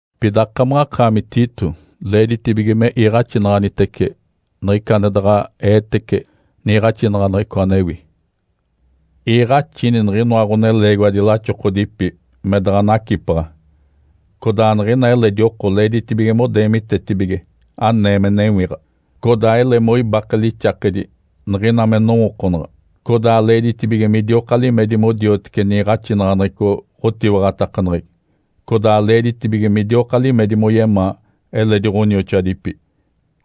Pida akamaɡ̶akaami Tito, leeditibige me iiɡ̶axinaɡ̶anitece niɡ̶ica ane daɡ̶a eetege niiɡ̶axinaɡ̶aneɡ̶eco anewi. Iiɡ̶axini niɡ̶inoa ɡ̶oneleegiwadi laxokodipi me daɡ̶a nacipaɡ̶a, codaa niɡ̶ina eledi oko leeditibige modeemitetibige anee me newiɡ̶a, codaa ele moibake lixakedi niɡ̶ina me nowookonaɡ̶a, codaa leeditibige midioka limedi modioteci niiɡ̶axinaɡ̶aneɡ̶eco ɡ̶otiwaɡ̶atakaneɡ̶egi, codaa leeditibige midioka limedi moyemaa eledi ɡ̶onioxoadipi,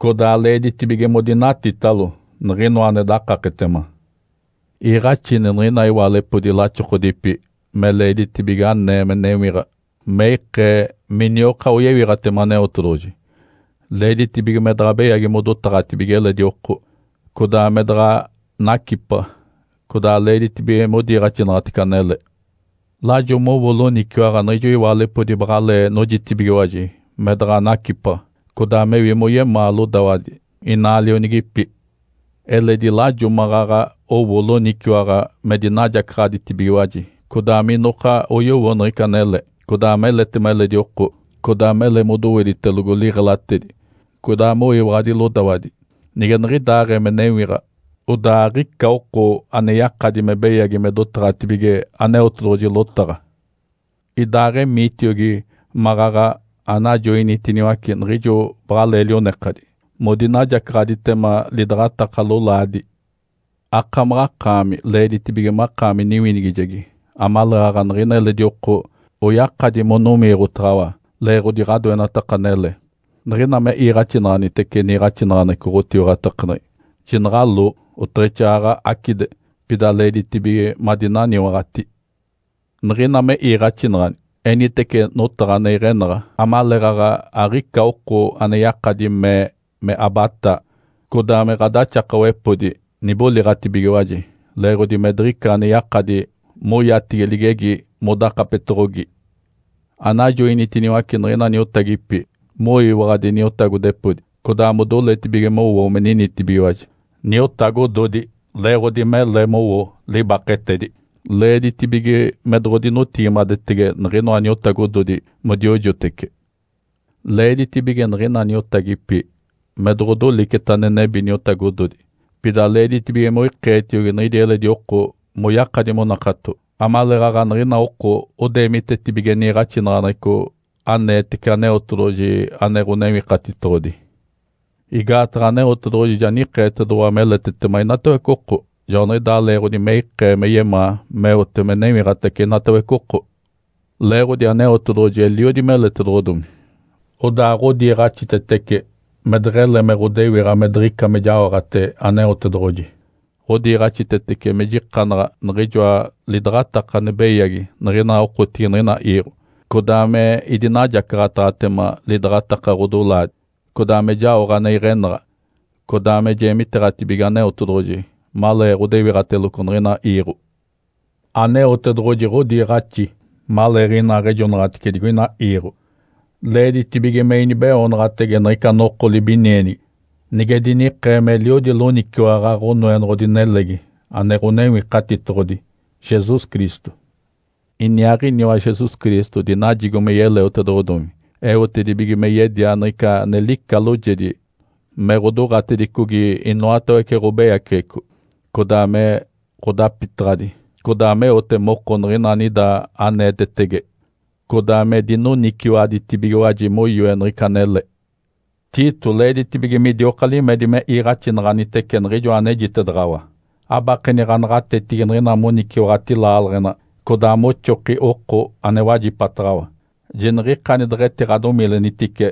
codaa leeditibige modinatitalo niɡ̶inoa ane dakaketema. Iiɡ̶axini niɡ̶ina iwaalepodi laxokodipi me leeditibige anee me newiɡ̶a me ikee minioka oyewiɡ̶atema Aneotedoɡ̶oji. Leeditibige me daɡ̶a beyagi modotaɡ̶atibige eledi oko, codaa me daɡ̶a nacipaɡ̶a. Codaa leeditibige modiiɡ̶axinaɡ̶atece anele. Lajo mowo loniciwaɡ̶a niɡ̶ijo iwaalepodi baɡ̶alee nojitibigiwaji me daɡ̶a nacipaɡ̶a, codaa mewi moyemaa lodawadi inaa lionigipi. Eledi lajo maɡ̶aɡ̶a owo loniciwaɡ̶a me dinajacaɡ̶aditibigiwaji, codaa minoka oyowo niɡ̶ica anele, codaa meletema eledi oko, codaa mele me doweditelogo liɡ̶elatedi, codaa moyiwaɡ̶adi lodawadi. Nige niɡ̶idaaɡ̶ee me newiɡ̶a, odaa aɡ̶ica oko ane yakadi me beyagi me dotaɡ̶atibige Aneotedoɡ̶oji lotaɡ̶a. Idaaɡ̶emiitiogi maɡ̶aɡ̶a anajoinitiniwace niɡ̶ijo baɡ̶alee lionekadi modinajacaɡ̶aditema lidaɡ̶ataka lolaadi. Akamaɡ̶akaami leeditibige makaami niwinigijegi amaleeɡ̶aɡ̶a niɡ̶ina eledi oko oyakadi monowiiɡ̶otaɡ̶awa leeɡ̶odi ɡ̶adoenataka anele. Niɡ̶ina me iiɡ̶axinaɡ̶anitece niiɡ̶axinaɡ̶aneɡ̶eco ɡ̶otiwaɡ̶atakaneɡ̶egi, jinaɡ̶aloo, oteɡ̶exaaɡ̶aɡ̶a acide, pida leeditibige madinaniwaɡ̶ati. Niɡ̶ina me iiɡ̶axinaɡ̶ani, enitece notaɡ̶a ane iɡ̶enaɡ̶a amaleeɡ̶aɡ̶a aɡ̶ica oko ane yakadi me ee me abataa, codaa me ɡ̶adaxakawepodi niboliɡ̶atibigiwaji leeɡ̶odi me diɡ̶ica ane yakadi moyatigi ligegi modakapetoɡ̶ogi. Anajoinitiniwace niɡ̶ina niotagipi moyiwaɡ̶adi niotagodepodi, codaa modoletibige mowo me ninitibigiwaji niotagododi leeɡ̶odi mele mowo libaketedi. Leeditibige me doɡ̶odinotigimadetege niɡ̶inoa niotagododi modiojotece. Leeditibige niɡ̶ina niotagipi me doɡ̶odoliceta ane nebi niotagododi. Pida leeditibige moikeetiogi niɡ̶idi eledi oko moyakadi monakato, amaleeɡ̶aɡ̶a niɡ̶ina oko odeemitetibige niiɡ̶axinaɡ̶aneɡ̶eco aneetece Aneotedoɡ̶oji ane Ǥonewikatitoɡ̶odi. Igaataɡ̶a Aneotedoɡ̶oji ja nikeetedoɡ̶owa meletetema inatawece oko. Joaniɡ̶idaa leeɡ̶odi me ikee me yemaa meote me newiɡ̶atace inatawece oko. Leeɡ̶odi Aneotedoɡ̶oji eliodi meletedoɡ̶odomi, odaa ɡ̶odiiɡ̶axitetece me deɡ̶ele me ɡ̶odewiɡ̶a me diɡ̶ica me jaoɡ̶ate Aneotedoɡ̶oji. Ǥodiiɡ̶axitetece me jikanaɡ̶a niɡ̶ijoa lidaɡ̶ataka ane beyagi niɡ̶ina okotigi niɡ̶ina iiɡ̶o, codaa me idinajacaɡ̶ataɡ̶atema lidaɡ̶ataka ɡ̶odolaadi, codaa me jaoɡ̶a ane iɡ̶enaɡ̶a, codaa me jeemiteeɡ̶atibige Aneotedoɡ̶oji malee ɡ̶odewiɡ̶ateloco niɡ̶ina iiɡ̶o. Aneotedoɡ̶oji ɡ̶odiiɡ̶axi maleeɡ̶inaaɡ̶ejonaɡ̶atice digoina iiɡ̶o leeditibige me inibeoonaɡ̶atege niɡ̶ica noko libinienigi nige dinikee meliodi loniciwaɡ̶a Ǥonoenoɡ̶odi nelegi ane Ǥonewikatitoɡ̶odi, Jesus Cristo. Iniaaɡ̶iniwa Jesus Cristo dinajigo me yeleotedoɡ̶odomi, eotedibige me yedia niɡ̶ica ane lica loojedi me ɡ̶odoɡ̶atedicogi inoatawece ɡ̶obeyaceɡ̶eco, codaa me ɡ̶odapitaɡ̶adi, codaa meote moko niɡ̶ina anida aneetetege, codaa me dinoniciwaɡ̶aditibigiwaji moyoe niɡ̶ica anele. Tito, leeditibige midioka limedi me iiɡ̶axinaɡ̶anitece niɡ̶ijoa anejitedaɡ̶awa. Abakeni ɡ̶anaɡ̶atetigi niɡ̶ina moniciwaɡ̶ati laaleɡ̶ena, codaa moxoki oko ane wajipataɡ̶awa. Jiniɡ̶ikani deɡ̶etiɡ̶adomilenitice,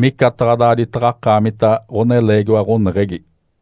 micataɡ̶a daaditaɡ̶a akaamita ɡ̶oneleegiwa ɡ̶oneɡ̶egi.